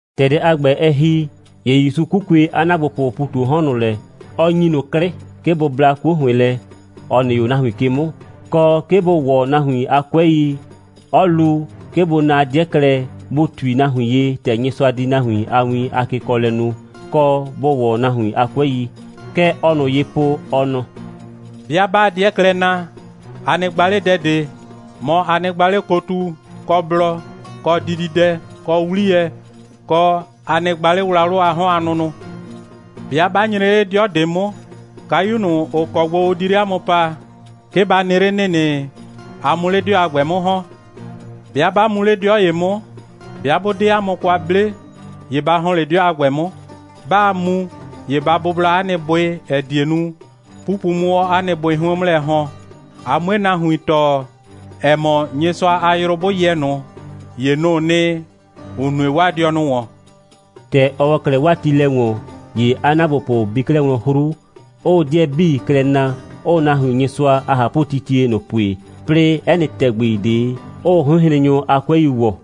‑Tɛ dɛ a ‑gbɛ, ɛ ‑hi, ‑ye ‑Yusu 'kukue 'a ‑naagbopʋʋ ‑pu ꞊tu 'o 'hɔn ꞊nʋ lɛ, 'ɔ ‑nyi ꞊nʋ 'klɩ, 'ke bʋ bla 'kuo ‑hʋɩn lɛ, ‑ɔ nɩ 'o nahuin ke 'mʋ, kɔ, 'ke bʋ ‑wɔ nahuin a 'kʋɛi, 'ɔ lu, 'ke bʋ na 'dɩɛ klɛ, bʋ ꞊tui nahuin ye, ‑tɛ Nyɩsʋa di nahuin a win a kekɔɔlɛ nu, kɔ, bʋ ‑wɔ nahuin a 'kʋɛi. Kɛ ɔɔ ꞊nʋ ye po, ɔ nɔ: «'Bɩa 'baa 'dɩɛ klɛ na, a nɩ gba 'le dɛ ꞊de, mɔ, a nɩ gba 'le kotu, kɔ blɔ, kɔ dididɛ, kɔ 'wliyɛ, kɔ, a nɩ gba 'le wlawlʋ a 'hɔn a nʋnʋ. 'Bɩa 'ba nyre 'le 'dɩɔ ꞊de 'mʋ, kayu ꞊nʋ, ‑ʋ kɔ gbo ʋ di 'le 'a mʋ paa, 'ke ba nɩ 'le ‑nɩnɩ, a 'mʋ 'le 'dɩɔ a ‑gbɛ 'mʋ ‑hɔn. 'Bɩa 'ba mu 'le 'dɩɔ ‑ye 'mʋ, 'bɩa 'bʋ 'de 'a mʋ kwa 'ble, ‑ye ba ‑hɔn 'le 'dɩɔ a ‑gbɛ 'mʋ. 'Baa mu, ‑ye ba bʋbla 'a nɩ bʋɩ, ‑ɛ die nu, 'pupu 'mʋ 'o 'a nɩ bʋɩ 'hʋɩn 'mʋ lɛ ‑hɔn, a 'mue nahuin tɔɔ, ‑ɛ mɔ, Nyɩsʋa a yrʋ 'bʋ yɛ ꞊nʋ, ‑ye nʋ‑ʋ nɩ, ‑ʋ nue 'waa dɩɔnʋ ‑wɔn.» ‑Tɛ ɔ ‑wɔ 'klɛɛ 'waa tiilɛ ‑wɔn, ‑ye 'a ‑naagbopʋ bi 'klɛɛ wlɔn 'hru, 'ʋʋ 'dɩɛ 'bii klɛ na, 'ʋʋ nahuin Nyɩsʋa a ꞊hapʋtitie ꞊nʋ pue, 'plɩɩ 'ɛ nɩ ‑tɛgbi ꞊de, 'ʋʋ 'hʋɩnhrennyʋ a 'kʋɛi ‑wɔ.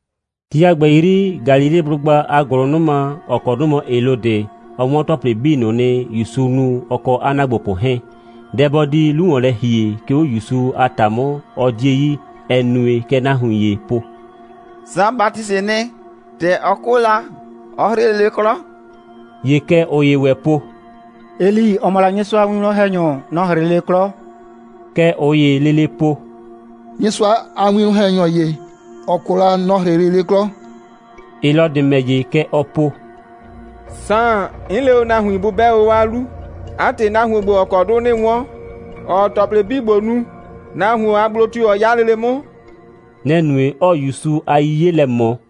Ti a ‑gbɛ 'yri, Galileblʋgba a ‑gʋlʋnʋma, ‑ɔ kɔ 'dʋ mɔ Helɔdɩ, ɔ 'wɔn ‑tɔplɩ 'bii ꞊nʋ nɩ, ‑Yusu nu, ɔ kɔ 'a ‑naagbopʋ 'hɛɛn. Dɛ bɔ di 'lu ‑wɔn lɛ ‑hie, 'ke 'o ‑Yusu a ‑ta 'mʋ, ɔ 'die yi, ‑ɛ nue, kɛ nahuin ‑yee po: «Saan Batisɩɩ nɩ. ‑Tɛ ɔ 'kʋ la, ɔ 'hrɩ lele 'klɔ.» ‑Ye kɛ ꞊ʋ ‑ye ‑wɛ po: «Eli, ‑ɔ mɔ la Nyɩsʋa a winwlɔn‑hɛnyɔ, nɔ‑ 'hrɩ lele 'klɔ.» Kɛ ꞊ʋ ‑yee lele po: «Nyɩsʋa a winwlɔn‑hɛnyɔ ‑ye, ‑ɔ 'kʋ la, nɔ‑ 'hrɩ lele 'klɔ.» Helɔdɩ ‑mɛ ‑ye, kɛ ɔɔ po: «Saan, 'n le o nahuin, bʋ 'bɛ o 'o 'a 'lu. 'A ‑tɩ, nahuon ‑gbo, ‑ɔ kɔ 'dʋ 'nɩɩ 'wɔn, ‑ɔɔ ‑tɔplɩ 'bii ‑gbo nu, nahuon a gblo tio‑ ɔ 'ya lele 'mʋ?» Nɛ‑ nue, 'ɔɔ ‑Yusu a 'yiye lɛ ꞊mɔ.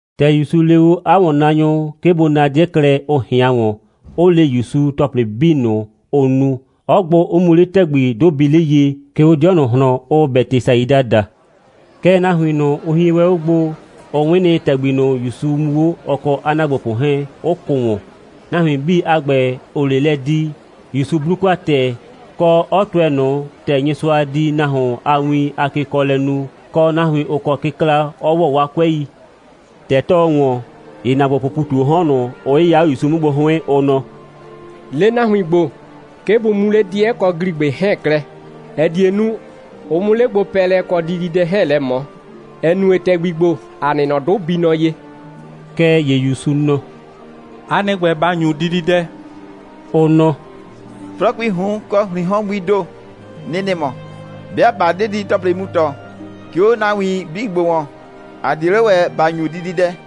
‑Tɛ ‑Yusu le o 'a ‑wɔnnaanyʋ, 'ke bʋ na o 'dɩɛ klɛ, ʋ ꞊hɩan ‑wɔn, 'ʋ le ‑Yusu ‑tɔplɩ 'bii ꞊nʋ, ʋ nu, 'ɔ gbʋ, 'ʋ mu 'le ‑tɛgbi, 'dʋ bii 'le ye, 'ke 'o 'dɩɔ ꞊nʋ ꞊hlɔn, ʋʋ Bɛtɩsaida daa. Kɛɛ, nahuin ꞊nʋ, ʋ hie wɛn 'o gbo, ʋ 'wɩn nɩ, ‑tɛgbi ꞊nʋ, ‑Yusu mu 'o, ɔ kɔ 'a ‑naagbopʋ 'hɛɛn, 'ʋ kʋ ‑wɔn. Nahuin 'bii a ‑gbɛ, ‑ʋʋ 'le lɛ di, ‑Yusu 'blu kwa ‑tɛɛ, kɔ, 'ɔ tʋɛ ꞊nʋ, ‑tɛ Nyɩsʋa di nahuon a win a kekɔɔlɛ nu, kɔ, nahuin, ‑ʋ kɔ kɩkla, 'ɔ ‑wɔ 'waa 'kʋɛi. ‑Tɛ 'tɔɔ ‑wɔn, ‑ye ‑naagbopʋʋ ‑pu ꞊tu 'o 'hɔn ꞊nʋ, ʋ 'yɩya 'o ‑Yusu 'mʋ gbo 'hʋɩn, ʋ nɔ: «Le nahuin ‑gbo, 'ke bʋ mu 'le 'dɩɛ kɔ ‑gligbɩ 'hɛɛn klɛ, ‑ɛ die nu, ʋ 'mʋ 'le gbopɛɛlɛ kɔ dididɛ 'hɛɛn lɛ ꞊mɔ, ‑ɛ nue, ‑tɛgbi ‑gbo, ‑a nɩ nɔ, 'dʋ bii nɔ ye.» Kɛɛ ‑ye ‑Yusu nɔ: «'A nɩ ‑gbɛ, ba ‑nyu dididɛ!» Ʋ nɔ: «'Flɔɔkuii ꞊hun kɔ ‑hriin 'hɔn gbii ‑do, nɩ‑ nɩ mɔ. 'Bɩa ꞊ba 'de didi‑tɔplɩ mu ‑tɔ, 'ke 'o nahuin 'bii ‑gbo ‑wɔn, ‑a 'die 'le ‑wɛ ‑ba ‑nyu dididɛ.»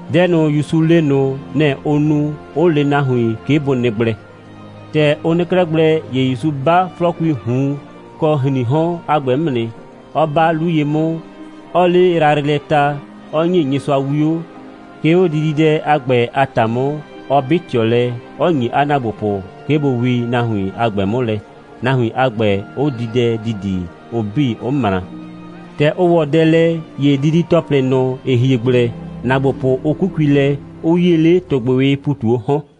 Dɛ ꞊nʋ, ‑Yusu le ꞊nʋ, nɛ‑ ʋ nu, 'ʋ le nahuin, 'ke bʋ nɩ gblɛ. ‑Tɛ ʋ nɩ 'klɛɛ gblɛ, ‑ye ‑Yusu 'ba 'flɔɔkui ꞊hun kɔ ‑hriin 'hɔn a ‑gbɛ 'mʋ nɩ, 'ɔ 'ba 'lu ye 'mʋ, 'ɔɔ 'le yrayrɩ lɛ ta, 'ɔ ‑nye Nyɩsʋa 'wio, 'ke 'o dididɛ a ‑gbɛ a ‑ta 'mʋ, 'ɔ 'bɩ ꞊tɩɔ lɛ, 'ɔ ‑nyi 'a ‑naagbopʋ, 'ke bʋ wii nahuin a ‑gbɛ 'mʋ lɛ, nahuin a ‑gbɛ, 'ʋ di dɛ ‑didi, ʋ 'bii, 'ʋ ꞊mra. ‑Tɛ ʋ ‑wɔ dɛ lɛ, ‑ye didi‑tɔplɩ ꞊nʋ, ‑ɩ hie gblɛ, ‑naagbopʋ 'ʋ 'kukui lɛ, 'ʋ 'yie 'le ‑tʋgbɩwɩɩ ‑pu ꞊tu 'o 'hɔn.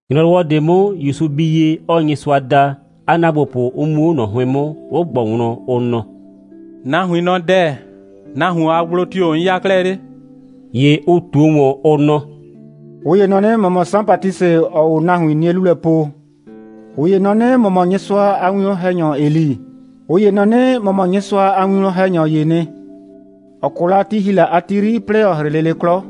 ‑Nyrɔwɔ ꞊de 'mʋ, ‑Yusu bii ye, 'ɔɔ Nyɩsʋa da, 'a ‑naagbopʋ 'ʋ mu 'o ꞊nɔ 'hʋɩn 'mʋ, 'ɔ ꞊gbʋ wlɔn, ɔ nɔ: «Nahuin nɔ dɛ‑, nahuon a gblo tio‑ 'n 'ya 'klɛɛ 'le?» ‑Ye ʋ ꞊tuo ꞊wɔn, ʋ nɔ: «꞊Ʋ ‑ye nɔ 'nɩ, ‑mɔ mɔ Saan Batisɩ, ‑ɔɔ o nahuin 'nie 'lu lɛ po. ꞊Ʋ ‑ye nɔ 'nɩ, ‑mɔ mɔ Nyɩsʋa a winwlɔn‑hɛnyɔ Eli. ꞊Ʋ ‑ye nɔ 'nɩ, ‑mɔ mɔ Nyɩsʋa a winwlɔn‑hɛnyɔ ‑yee nɩ, ‑ɔ 'kʋ la, ti ‑hi la a ti 'yri, 'plɩɩ ‑ɔ 'hrɩ lele 'klɔ.»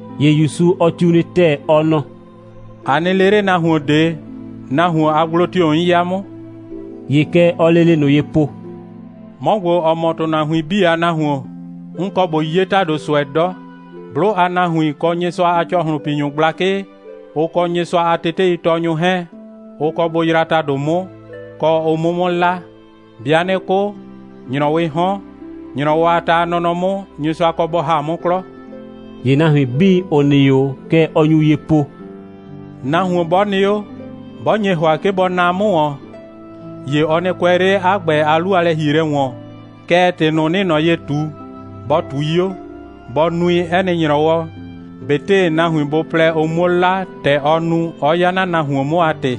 ‑Ye ‑Yusu, ɔ tiu nɩ ‑tɛɛ, ɔ nɔ: «A nɩ le 'le nahuon ꞊de, nahuon a gblo tio‑ 'n 'ya 'mʋ!» ‑Ye kɛ ɔɔ lele ꞊nʋ ye po: «'Mɔ ‑gbo, ‑ɔ mɔ ‑tʋnahuin 'bii a Nahuon, 'n kɔ ꞊bo 'ye ‑tado ꞊sʋɛ 'dɔ. 'Blʋ a nahuin, kɔ Nyɩsʋa a ‑cɔhlʋnpinyʋ gblakɩ, ʋ kɔ Nyɩsʋa a teteitɔɔnyʋ 'hɛɛn, ʋ kɔ bʋ yraa ‑tado 'mʋ, kɔ, ʋ 'mʋ 'mʋ 'la. 'Bɩa 'nɩ 'kʋ, ‑nyrɔwɩɩ 'hɔn, ‑nyrɔwɔ a ta a nɔnɔ 'mʋ, Nyɩsʋa kɔ bɔ ‑ha 'mʋ 'klɔ.» ‑Ye nahuin 'bii, ‑ʋ nɩ 'o, kɛ ɔ nyu ye po: «Nahuon 'bɔ nɩ 'o, 'bɔ nye ‑hʋa, 'ke bɔ naa 'mʋ ‑wɔn, ‑ye ɔ nɩ kʋɛ 'le 'a ‑gbɛ a 'lu a lɛ‑hielɛ ‑wɔn, kɛɛ, ‑tɩ ꞊nʋ, 'nɩɩ ꞊nɔ ye ꞊tu, bɔ ꞊tui 'o, bɔ nui 'ɛ nɩ ‑nyrɔwɔ, ꞊betɩ nahuin bʋ plɛ, ʋ 'muo 'la, ‑tɛ ɔ nu, 'ɔ 'ya 'na nahuon 'mʋ a ‑tɩ.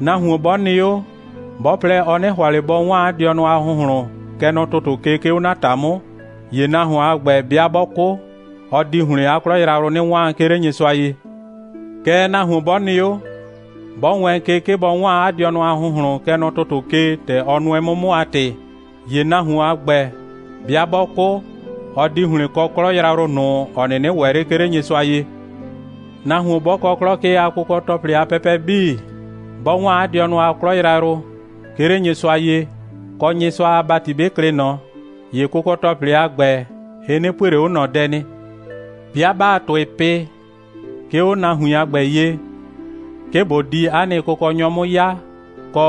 Nahuon 'bɔ nɩ 'o, 'bɔ plɛ, ɔ 'nɩ ‑hʋa ꞊le bɔ 'waan 'a dɩɔnʋ a ‑hʋnhlʋn, kɛ nɔ ‑tʋtʋ ke, 'ke 'o 'na ‑ta 'mʋ, ‑ye nahuon a ‑gbɛ 'bɩa 'bɔ 'kʋ, ɔ di ‑hlɩn 'a 'klɔ yrayrʋ 'nɩ 'waan, 'ke 'le Nyɩsʋa ye. Kɛɛ, nahuon 'bɔ nɩ 'o, 'bɔ wɛɛn ke, 'ke bɔ 'waan 'a dɩɔnʋ a ‑hʋnhlʋn, kɛ nɔ ‑tʋtʋ ke, ‑tɛ ɔ nʋɛ 'mʋ 'mʋ a ‑tɩ, ‑ye nahuon a ‑gbɛ, 'bɩa 'bɔ 'kʋ, ɔ di ‑hlɩn kɔ 'klɔ yrayrʋ ꞊nʋ, ‑ɔ 'nɩnɩ ‑wɛ 'le, 'ke 'le Nyɩsʋa ye. Nahuon 'bɔ kɔ 'klɔ ke a kʋkɔ‑tɔplɩ a pɛpɛ 'bii, 'bɔ 'waan 'a dɩɔnʋ a 'klɔ yrayrʋ, 'ke 'le Nyɩsʋa ye, kɔ, Nyɩsʋa a ‑bati 'bɩ klɩ ꞊nɔ, ‑ye kʋkɔ‑tɔplɩ a ‑gbɛ, ɩ 'nɩ pue ꞊le 'o ꞊nɔ dɛ nɩ. 'Bɩa 'baa ‑tʋɩ pɩ, 'ke 'o nahuin a ‑gbɛ ye, 'ke ꞊bo di 'a nɩ Kʋkɔnyɔ 'mʋ 'ya, kɔ,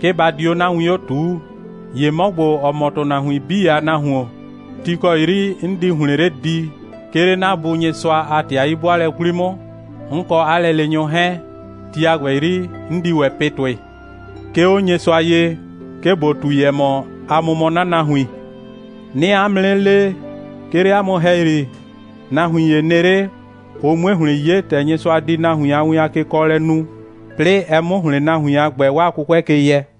'ke ba di 'o 'na win 'o ꞊tuu, ‑ye 'mɔ ‑gbo, ‑ɔ mɔ ‑tʋnahuin 'bii a Nahuon, ti ‑kɔ ti 'yri 'n di ‑hlɩn 'le di, 'ke 'le 'na Bu Nyɩsʋa a ‑tɩ a 'yi'bʋaalɛ 'kwli 'mʋ, 'n kɔ 'a lɛleenyʋ 'hɛɛn, ti a ‑gbɛ 'yri, 'n di ‑wɛ pɩ ‑tʋɩ, 'ke 'o Nyɩsʋa ye, 'ke ꞊bo ꞊tui, ‑ɛ mɔ, 'a mʋ mɔ 'na nahuin. 'Nɩɩ 'a mʋ 'nɩ le, 'ke 'le 'a mʋ ‑hɛyri, nahuin ‑ye nɩ 'le, ʋ 'mue ‑hlɩn 'ye, ‑tɛ Nyɩsʋa di nahuin a win a kekɔɔlɛ nu, 'plɩɩ ɛ 'mʋ ‑hlɩn nahuin a ‑gbɛ 'waa 'kʋkʋɛ ke yɛ.»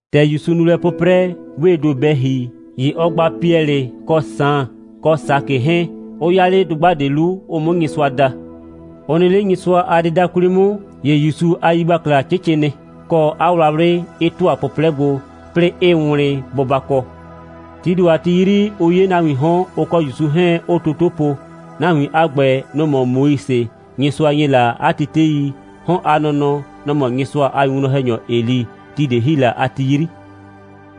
‑Tɛ ‑Yusu nu lɛ 'pʋprɛ, 'wee ‑do bɛ ‑hi, ‑ye ɔ gba Piɛlɩ kɔ Saan kɔ Sakɩ 'hɛɛn, 'ʋ 'ya 'le dʋgba ꞊de 'lu, ʋ 'mʋ Nyɩsʋa da. Ʋ nɩ 'le Nyɩsʋa a dɩda 'kwli 'mʋ, ‑ye ‑Yusu a yigbakla 'cɩcɩ nɩ, kɔ, 'a wlawlɩ 'ɩ ‑tʋa 'pʋplɛ gbo, 'plɩɩ 'ɩɩ wlɩn bʋbakɔ. Tii ‑do a ti 'yri, ʋ 'ye nahuiin 'hɔn, ʋ kɔ ‑Yusu 'hɛɛn 'ʋʋ toto po. Nahuin a ‑gbɛ, nʋ‑ mɔ Moise, Nyɩsʋa ‑nye la tetei, 'hɔn a nɔnɔ, nɔ‑ mɔ Nyɩsʋa a winwlɔn‑hɛnyɔ Eli, ti ꞊de ‑hi la a ti 'yri.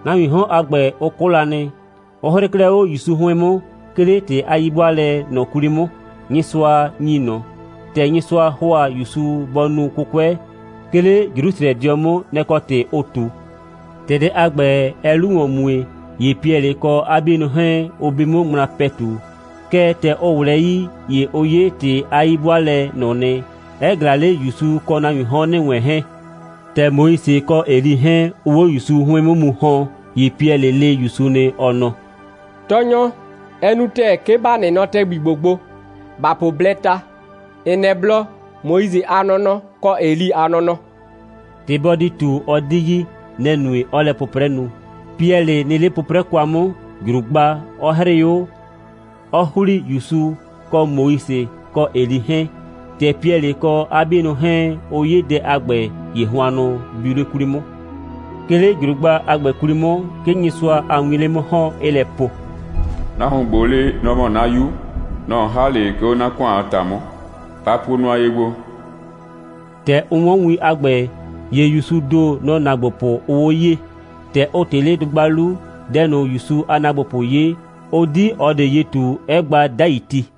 Nahuiin 'hɔn a ‑gbɛ, ʋ 'kʋ la nɩ, 'ʋ 'hrɩɩ 'klɛɛ 'o ‑Yusu 'hʋɩn 'mʋ, 'ke 'le ‑tɩ a 'yi'bʋaalɛ ꞊nʋ 'kwli 'mʋ, Nyɩsʋa ‑nyi ꞊nʋ. ‑Tɛ Nyɩsʋa ‑hʋa ‑Yusu bɔ nu 'kʋkʋɛ, 'ke 'le Jrusrɛdɩɔ 'mʋ, nɛ‑ kɔ ‑tɩ ʋʋ ꞊tu. ‑Tɛ dɛ a ‑gbɛ, ɛɛ 'lu ‑wɔn mue, ‑ye Piɛlɩ kɔ 'a 'bienʋ 'hɛɛn, ʋ bi 'mʋ ŋmla ‑pɛtu. Kɛɛ, ‑tɛ ʋ ꞊wlɛɛ 'yii, ‑ye ʋ 'ye ‑tɩ a 'yi'bʋaalɛ ꞊nʋ nɩ, 'ɛ ꞊glaa 'le ‑Yusu kɔ nahuiin 'hɔn ‑nɩ wɛn 'hɛɛn. ‑Tɛ Moise kɔ Eli 'hɛɛn, ʋʋ 'o ‑Yusu 'hʋɩn 'mʋ mu ‑hɔn, ‑ye Piɛlɩ le ‑Yusu nɩ, ɔ nɔ: «Tɔɔnyɔ, ɛ nu ‑tɛɛ, 'ke ‑ba nɩ nɔ ‑tɛgbi ‑gbo gbo. ‑Ba po blɛɛ ta, ‑n nɛ blɔ, Moise a nɔnɔ, kɔ Eli a nɔnɔ.» ‑Tɩ bɔ di ꞊tu, ɔ 'di yi. Nɛ‑ nue, 'ɔɔ lɛ 'pʋprɛ nu. Piɛlɩ nɩ 'le 'pʋprɛ kwa 'mʋ, ‑jrugba 'ɔ 'hrɩɩ 'o, 'ɔ ‑hli ‑Yusu kɔ Moise kɔ Eli 'hɛɛn. ‑Tɛ Piɛlɩ kɔ 'a 'bienʋ 'hɛɛn, ʋ 'ye dɛ a ‑gbɛ, ‑ye hʋannʋ biu 'le 'kwli 'mʋ. 'Ke 'le ‑jrugba a ‑gbɛ 'kwli 'mʋ, 'ke Nyɩsʋa a wiin 'le 'mʋ ‑hɔn, 'ɩɩ lɛ po: «Nahuon ‑gbo le, nɔ‑ mɔ 'na 'Yu. Nɔ‑ 'n ‑ha 'le, 'ke 'o 'na ‑kʋan a ‑ta 'mʋ. Ba puo nʋa ye gbo!» ‑Tɛ ʋ 'wɔn win a ‑gbɛ, ‑ye ‑Yusuu ‑do, nɔ‑ ‑naagbopʋ, ʋʋ 'o 'yee. ‑Tɛ ʋ ꞊tɩ 'le dʋgba 'lu, dɛ ꞊nʋ, ‑Yusu a ‑naagbopʋ 'ye, ʋ 'di ꞊ɔ ꞊de ye ꞊tu, 'ɛ gba 'dai ti.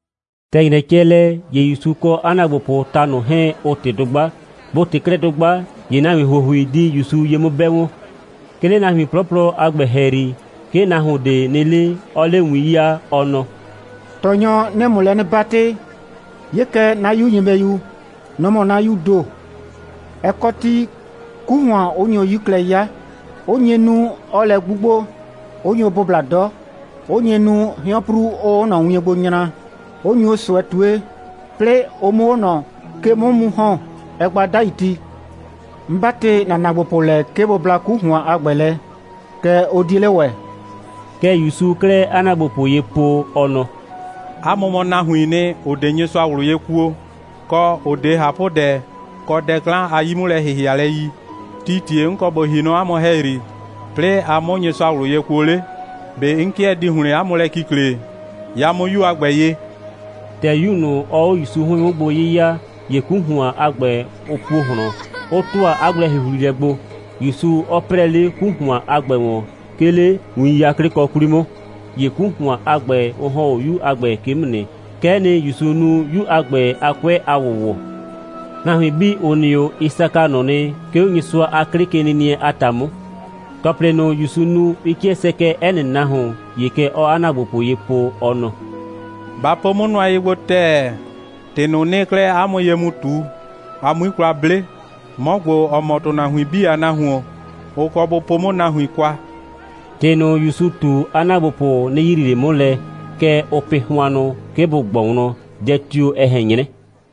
‑Tɛ ‑nyrɛ cɛ lɛ, ‑ye ‑Yusu kɔ 'a ‑naagbopʋʋ ta ꞊nʋ 'hɛɛn, ʋ ꞊tɩ dʋgba. Bʋ ꞊tɩ 'klɛɛ dʋgba, ‑ye nahuin ‑huohui di ‑Yusu ye 'mʋ 'bɛ wɔn. 'Ke 'le nahuin 'plɔplɔ a ‑gbɛ ‑hɛyri, 'ke nahuon ꞊de nɩ 'le, 'ɔɔ 'le win 'yaa, ɔ nɔ: «Tɔɔnyɔ, 'nɩɩ ‑mʋ lɛ 'nɩ 'batɩ, 'ye kɛ 'na 'yu nyɩbɛyu. Nɔ‑ mɔ 'na 'yuu ‑do. Ɛ kɔ ti, 'ku ‑hʋan 'ʋ nyo 'yi klɛ 'ya, 'ʋ nye nu, 'ɔɔ lɛ 'gbugbo, 'ʋ nyo bʋbla 'dɔ, 'ʋ nye nu, hɩɔnpru 'ʋʋ ꞊nɔ wien gbo nyra, 'ʋ nyo ꞊sʋɛ ꞊tue. 'Plɩɩ ʋ 'mʋ 'o ꞊nɔ ke 'mʋ mu ‑hɔn, ɛɛ gba 'dai ti. 'N 'batɩ ‑na ‑naagbopʋ lɛ, 'ke bʋ bla 'ku ‑hʋan a ‑gbɛ lɛ, kɛɛ, ʋ 'die 'le ‑wɛ.» Kɛ ‑Yusuu 'klɛɛ 'a ‑naagbopʋ ye po, ɔ nɔ: «'A mʋ mɔ nahuiin nɩ, ‑ʋ 'de Nyɩsʋa ꞊wlʋ ye kuo, kɔ, ‑ʋ 'de ꞊hapʋdɛ kɔ dɛ 'klan a 'yi'mʋlɛ‑hɩhɩalɛ yi. Tii ‑tie 'n kɔ ꞊bo ‑hi nɔ 'a mʋ ‑hɛyri, 'plɩɩ a 'mʋ Nyɩsʋa ꞊wlʋ ye kuo 'le? ꞊Be 'n 'kɩɛ die ‑hlɩn 'a mʋ lɛ kikle? Ya 'mʋ ‑na 'yu a ‑gbɛ ye!» ‑Tɛ 'yu ꞊nʋ, ɔɔ 'o ‑Yusu 'hʋɩn 'mʋ gbo 'yɩya, ‑ye 'ku ‑hʋan a ‑gbɛ, ʋ puo ꞊hlɔn, 'ʋ ‑tʋa 'a gblɛ‑huhlilɛ gbo, ‑Yusu 'ɔ 'prɛɛ 'le 'ku ‑hʋan a ‑gbɛ ‑wɔn, 'ke 'le win 'yaklɩkɔ 'kwli 'mʋ. ‑Ye 'ku ‑hʋan a ‑gbɛ, ʋ ‑hɔn 'o 'yu a ‑gbɛ ke 'mʋ nɩ. Kɛ'ɛ nɩ, ‑Yusu nu 'yu a ‑gbɛ a 'kʋɛ a ‑wʋwɔ. Nahuin 'bii, ‑ʋ nɩ 'o, ɩ saka ꞊nʋ nɩ, 'ke 'o Nyɩsʋa a 'klɩkenɩnɩɛ a ‑ta 'mʋ. ‑Tɔplɩ ꞊nʋ, ‑Yusu nu, ɩ 'kɩɛ sɛkɛɛ 'ɛ nɩ nahuon. ‑Ye kɛ ɔɔ 'a ‑naagbopʋ ye po, ɔ nɔ: «Ba po 'mʋ nʋa ye gbo ‑tɛɛ, ‑tɩ ꞊nʋ, 'nɩɩ 'klɛɛ 'a mʋ ye mu ꞊tu, a 'mui kwa 'ble: 'Mɔ ‑gbo, ‑ɔ mɔ ‑tʋnahuin 'bii a Nahuon, ʋ kɔ bʋ po 'mʋ nahuin kwa.» ‑Tɩ ꞊nʋ, ‑Yusu ꞊tu, 'a ‑naagbopʋ 'nɩ yrii ꞊le 'mʋ lɛ. Kɛɛ, ʋʋ pɩ hʋannʋ, 'ke bʋ ꞊gbɔ wlɔn, dɛ tio‑ ɛ ꞊hɛn 'nyrɛ.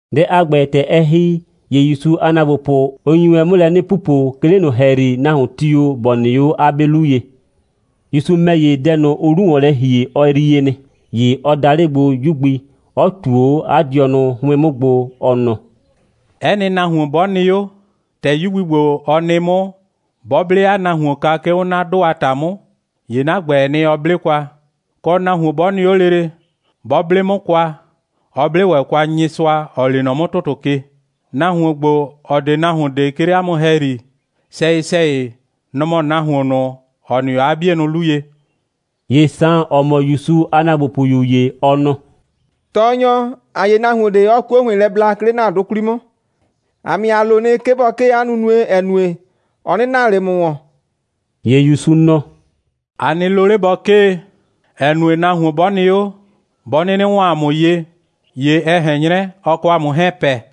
Dɛ a ‑gbɛ, ‑tɛ ɛ ‑hi, ‑ye ‑Yusu a ‑naagbopʋ, ʋ nyi wɛn 'mʋ lɛ 'nɩ pupo, 'ke 'le ꞊nʋ ‑hɛyri, nahuon tio‑ ‑bɔ nɩ 'o 'a 'be 'lu ye. ‑Yusu ‑mɛ ‑ye, dɛ ꞊nʋ, ʋʋ 'lu ‑wɔn lɛ ‑hie, ɔ yrie nɩ. ‑Ye ɔ da 'le gbo 'yu gbi, 'ɔ ꞊tuo 'o 'a dɩɔnʋ 'hʋɩn 'mʋ gbo, ɔ nɔ: «'Ɛ nɩ nahuon 'bɔ nɩ 'o, ‑tɛ 'yu gbi ‑gbo, ɔ nɩ 'mʋ, 'bɔ 'ble 'a nahuon kwa, 'ke 'o 'na 'dʋ a ‑ta 'mʋ, ‑ye 'na ‑gbɛɛ nɩ, ɔ 'ble kwa. Kɔ, nahuon 'bɔ nɩ 'o lele, 'bɔ 'ble 'mʋ kwa, ɔ 'ble ‑wɛ kwa Nyɩsʋa, ‑ɔ lee nɔ 'mʋ ‑tʋtʋ ke. Nahuon ‑gbo, ‑ɔ 'de nahuon ꞊de, 'ke 'le 'a mʋ ‑hɛyri, sɛyɩ‑sɛyɩ, nɔ‑ mɔ nahuon ꞊nʋ, ‑ɔ nɩ 'o 'a 'bienʋ 'lu ye.» ‑Ye Saan, ‑ɔ mɔ ‑Yusu a ‑naagbopʋyu ‑ye, ɔ nɔ: «Tɔɔnyɔ, ‑a 'ye nahuon ꞊de, 'ɔɔ 'kuo ‑hʋɩn lɛ bla, 'ke 'le ‑na 'dʋ 'kwli 'mʋ. ‑A ‑mɛ ‑ye, ‑a lo nɩ, 'ke bɔ 'kee 'a nunue, ‑ɛ nue, ɔ 'nɩ naa ꞊le ‑a mʋ ‑wɔn.» ‑Ye ‑Yusu nɔ: «A nɩ lo 'le bɔ 'kee, ‑ɛ nue, nahuon 'bɔ nɩ 'o, 'bɔ 'nɩnɩ ‑wɔn 'a mʋ ye, ‑ye ɛ ꞊hɛn 'nyrɛ, ɔ kɔ 'a mʋ 'hɛɛn pɛ.»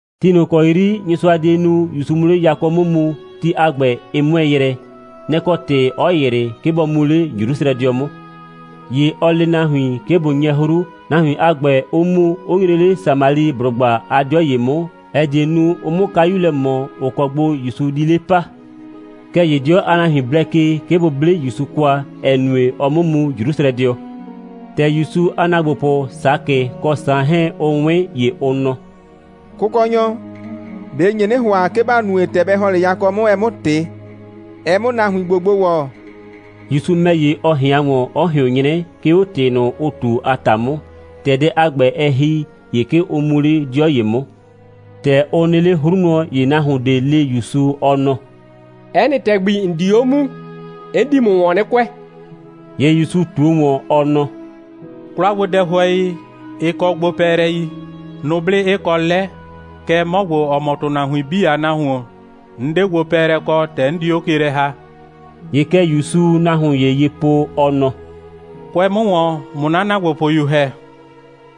Ti ꞊nʋ ‑kɔ 'yri Nyɩsʋa die nu, ‑Yusu 'mʋ 'le yakɔ 'mʋ mu, ti a ‑gbɛ, ɩ 'mʋɛɛ yrɛ. Nɛ‑ kɔ ‑tɩ 'ɔ ‑yrɩ, 'ke bɔ mu 'le Jrusrɛdɩɔ 'mʋ. ‑Ye ɔ le nahuin, 'ke bʋ 'nyɛ 'hru, nahuin a ‑gbɛ 'ʋ mu, 'ʋ nyre 'le Samaliblʋgba a 'dɩɔ ‑ye 'mʋ, ‑ɛ die nu, ʋ 'mʋ kayu lɛ ꞊mɔ, ‑ʋ kɔ gbo ‑Yusu di 'le pa. Kɛɛ ‑ye 'dɩɔ a nahuin blɛ ke, 'ke bʋ 'ble ‑Yusu kwa, ‑ɛ nue, ɔɔ 'mʋ mu Jrusrɛdɩɔ. ‑Tɛ ‑Yusu a ‑naagbopʋ Sakɩ kɔ Saan 'hɛɛn, ʋ 'wɩn, ‑ye ʋ nɔ: «Kʋkɔnyɔ, ꞊be ‑n nye 'nɩ ‑hʋa, 'ke ‑ba nue, ‑tɛ bɛ ‑hɔn 'le yakɔ 'mʋ, ɛ 'mʋ ꞊tɩ, ɛ 'mʋ nahuin ‑gbo gbo ‑wɔ?» ‑Yusu ‑mɛ ‑ye, ɔ ꞊hɩan ‑wɔn, 'ɔ ꞊hɩʋn 'nyrɛ, 'ke 'o ‑tɩ ꞊nʋ, ʋ ꞊tu, a ‑ta 'mʋ. ‑Tɛ dɛ a ‑gbɛ, ɛ ‑hi, ‑ye 'ke ʋ mu 'le 'dɩɔ ‑ye 'mʋ. ‑Tɛ ʋ nɩ 'le 'hru wlɔn, ‑ye nahuon ꞊de le ‑Yusu, ɔ nɔ: «'Ɛ nɩ ‑tɛgbi, ‑n di 'o muu, 'n di ‑mʋ ‑wɔn 'nɩ kʋɛ.» ‑Ye ‑Yusu ꞊tuo ‑wɔn, ɔ nɔ: «'Kwlagbodɛhʋɛi, ɩ kɔ gbopɛɛlɛi, nʋblɩ 'ɩ kɔ 'lɛ, kɛɛ, 'mɔ ‑gbo, ‑ɔ mɔ ‑tʋnahuin 'bii a Nahuon, 'n 'de gbopɛɛlɛ kɔ, ‑tɛ 'n di 'o ke lɛ ‑ha.» ‑Ye kɛ ‑Yusuu nahuon ‑ye ye po, ɔ nɔ: «Kʋɛ 'mʋ ‑wɔn, ꞊mʋ 'na ‑naagbopʋyu ‑hɛ!»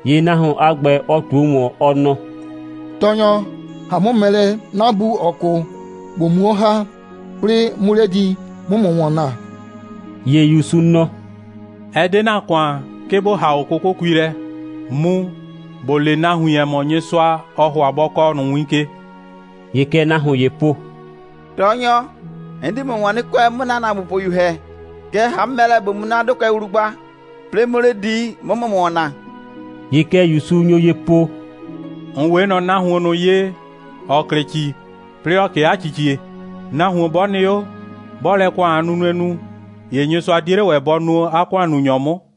‑Ye nahuon a ‑gbɛ, ɔ ꞊tuo ‑wɔn, ɔ nɔ: «Tɔɔnyɔ, ‑ha 'mʋ mɛ lɛ, 'na bu, ‑ɔ 'kʋ, ꞊bo muo 'o ‑ha, 'plɩɩ 'mʋ 'le di, 'mʋ ‑mʋ ‑wɔn naa.» ‑Ye ‑Yusu nɔ: «Ɛ 'de ‑na ‑kʋan, 'ke ‑bo ‑ha 'o 'kʋkʋkui lɛ. Mu, ‑bo le nahuin, ‑ɛ mɔ, Nyɩsʋa, ɔɔ ‑hʋa bɔ kɔɔ ꞊nʋ win ke.» ‑Ye kɛ nahuon ‑yee po: «Tɔɔnyɔ, 'n di ‑mʋ ‑wɔn 'nɩ kʋɛ, 'mʋ ‑na ‑naagbopʋyu ‑hɛ. Kɛɛ, ‑ha 'mʋ mɛ lɛ, ꞊bo mu 'na 'dʋkʋɛ wlu gba, 'plɩɩ 'mʋ 'le di, 'mʋ ‑mʋ ‑wɔn naa.» ‑Ye kɛ ‑Yusu nyo ye po: «‑N 'we ꞊nɔ nahuon ꞊nʋ ye, ‑ɔ klɩ ‑ci, 'plɩɩ ‑ɔ 'kee 'a ‑cicie. Nahuon 'bɔ nɩ 'o, 'bɔɔ lɛ ‑kʋan a nunue nu, ‑ye Nyɩsʋa 'die 'le ‑wɛ bɔ nuo 'a ‑kʋannunyɔ 'mʋ.»